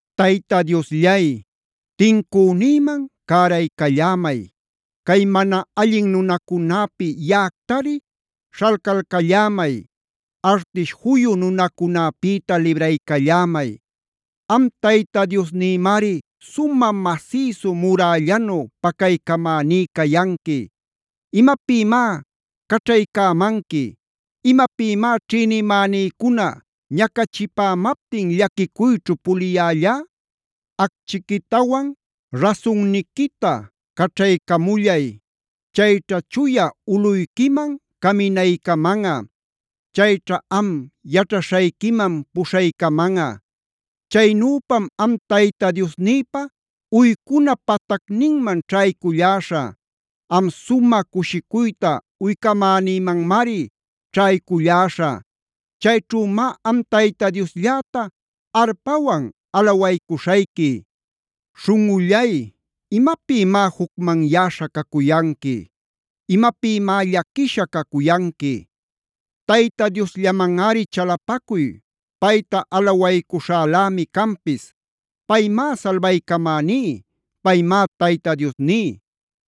Tayta Diosllay, tincünïman cäraycallämay. Cay mana allin nunacunäpi yaꞌactari śhalcalcallämay. Artish juyu nunacunäpïta libraycallämay. Am Tayta Diosnïmari sumä masïsu murällänu pacaycamäní cayanqui. ¿Imapïmá caćhaycämanqui? ¿Imapïmá ćhïnimänïcuna ñacachimaptin llaquicuyćhu puliyällá? Acchiquitawan rasunniquita caćhaycamullay. Chayćha chuya ulꞌuyquiman caminaycamanꞌa. Chayćha am yaćhaśhayquiman puśhaycamanꞌa. Chaynüpam am Tayta Diosnïpa uycuna patacninman ćhayculläśhä. Am sumä cushicuyta uycamänïmanmari ćhayculläśhä. Chayćhümá am Tayta Dioslläta arpawan alawaycuśhayqui. Śhunꞌullay, ¿imapïmá jucmanyäśha cacuyanqui? ¿Imapïmá llaquisha cacuyanqui? Tayta Diosllamanꞌari chalapacuy. Payta alawaycuśhälämi canpis. Paymá salbaycamäní. Paymá Tayta Diosní.